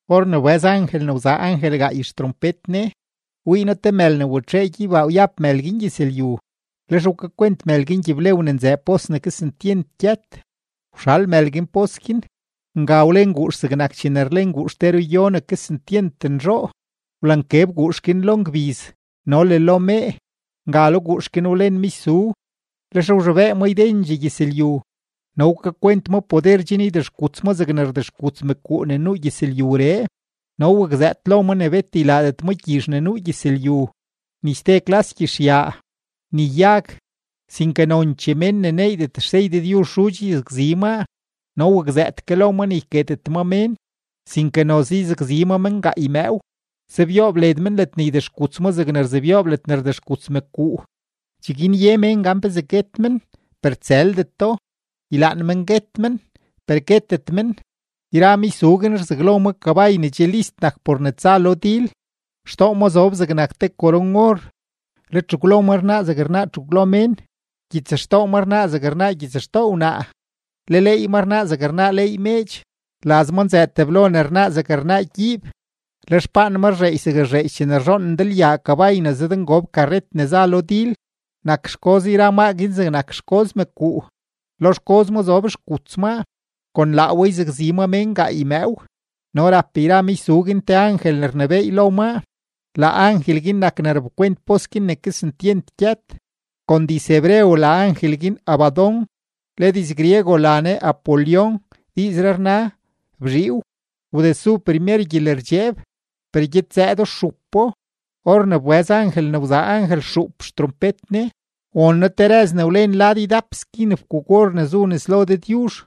Or ne wbëz angel ne wzaa angel gaay xtrompet ne, wii noo te mël ne watxee gyeybaa wyab mël guin gyëzlyu; lex wkakwent mël guin gyiblew ne nzëë pos ne kesentyent gyët. Wxal mël guin pos guin, nga wlen guux zegnak chene rlen guux te ruyo ne kesentyent nzhoo; wlankeb guux guin lo ngbiz no le lo mee. Nga lo guux guin wlen michzu, lex wzhobee ma ydendxee gyëzlyu, no wkakwent ma poder chen ydexkuts ma zegne rdexkuts mëkuu ne nuu gyëzlyuree. No wakzëët lo ma ne bet ylaadet ma gyizh ne nuu gyëzlyu, ni ste klas gyizhyaa, ni yag, sinke nonchee mén ne neeydet xsey Dëdyuzh xudx yzakzi maa. No wakzëët ke lo ma ne yketet ma mén, sinke noze yzakzi ma men gaay mëëw, sebyoob led men ledne ydexkuts ma zegne rzebyoob ledne rdexkuts mëkuu. Cheguin ye mén gan pezee guet men, per tsëldeto; ylaan men guet men, per guetet men. Yra michzu guin rzaglo ma kabay ne che list nak por ne tsa lo dil; xtoo ma zob zegnak te koron-or, le txegwlo ma rnaa zeg rnaa txegwlo mén. Gyitsxtoo ma rnaa zeg rnaa gyitsxtoo wnaa, le leey ma rnaa zeg rnaa leey meedx. Laz ma nzëë teblo ne rnaa zeg rnaa gyiib, le xpaan ma rzheedx zeg rzheedx chene rzhoon ndalyaa kabay ne zëdngob karret ne za lo dil. Nak xgoz yra maa guin zegnak xgoz mëkuu, lo xgoz ma zob xguts maa; kon laa we yzakzi ma mén gaay mëëw. No rap yra michzu guin te angel ne rnebééy lo maa; laa angel guin nak ne rapkwent pos guin ne kesentyent gyët; kon diz-hebreo la angel guin Abadón, le diz-griego la ne Apolión, diizree rna bzhiiw. Wdesu primer gyelerdxeeb, per gyed zëëdo stxupo. Or ne wbëz angel ne wzaa angel xuup xtrompet ne, won noo te rëz ne wlen lad ydap skin fkuuk-or ne zu nes lo Dëdyuzh.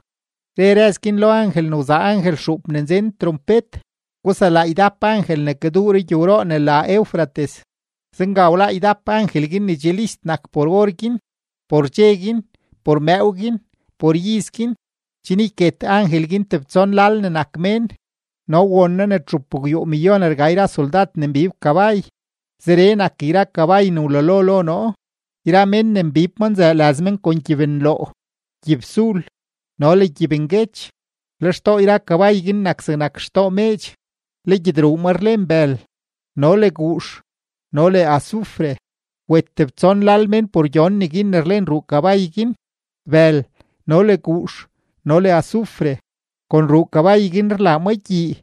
Re rëz guin lo angel ne wzaa angel xuup ne nzen trompet: ―Guselaa ydap angel ne kaduu rugyowroo ne la Eufrates. Zenga wláá ydap angel guin ne che list nak por or guin, por dxe guin, por mëëw guin, por iz guin, chen yket angel guin tebtson lal ne nak mén. No won noo ne txupgwyuumillón rga yra soldad ne mbib kabay. Zeree nak yra kabay ne wlalo lo noo; yra mén ne mbib maa nzëë laz men kon gyibnloo, gyibsul, no le gyibnguech. Le xtoo yra kabay guin nak zegnak xtoo meedx, le gyedruu ma rlen bël no le guux no le azufre. Wet tebtson lal mén por gyon neguin ne rlen ruu kabay guin: bël no le guux no le azufre. Kon ruu kabay guin rlaa ma gyii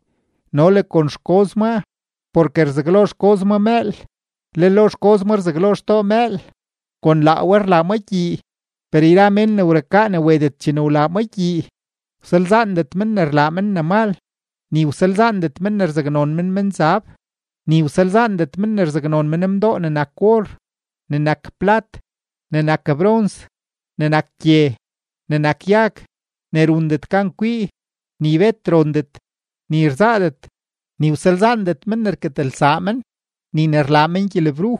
no le kon xgoz maa, porke rzaglo xgoz ma mëël, le lo xgoz ma rzaglo xtoo mëël, kon laa we rlaa ma gyii. Per yra mén ne wrukaa ne wetet chene wlaa maa guin gyii, wsalzaandet men ne rlaa men ne mal, ni wsalzaandet men ne rzaknon men menzab, ni wsalzaandet men ne rzaknon men mdoo ne nak or, ne nak plat, ne nak brons, ne nak gye, ne nak yag, ne rundet gan kwii, ni bet rondet, ni rzaadet. Ni wsalzaandet men ne rketelsaa men, ni ne rlaa men gyelebruj,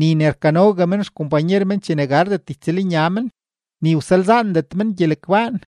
ni ne rkanogue men xkompanyer men chene gardet ytsëlnya men, ni wsalzaandet men gyelegbaan.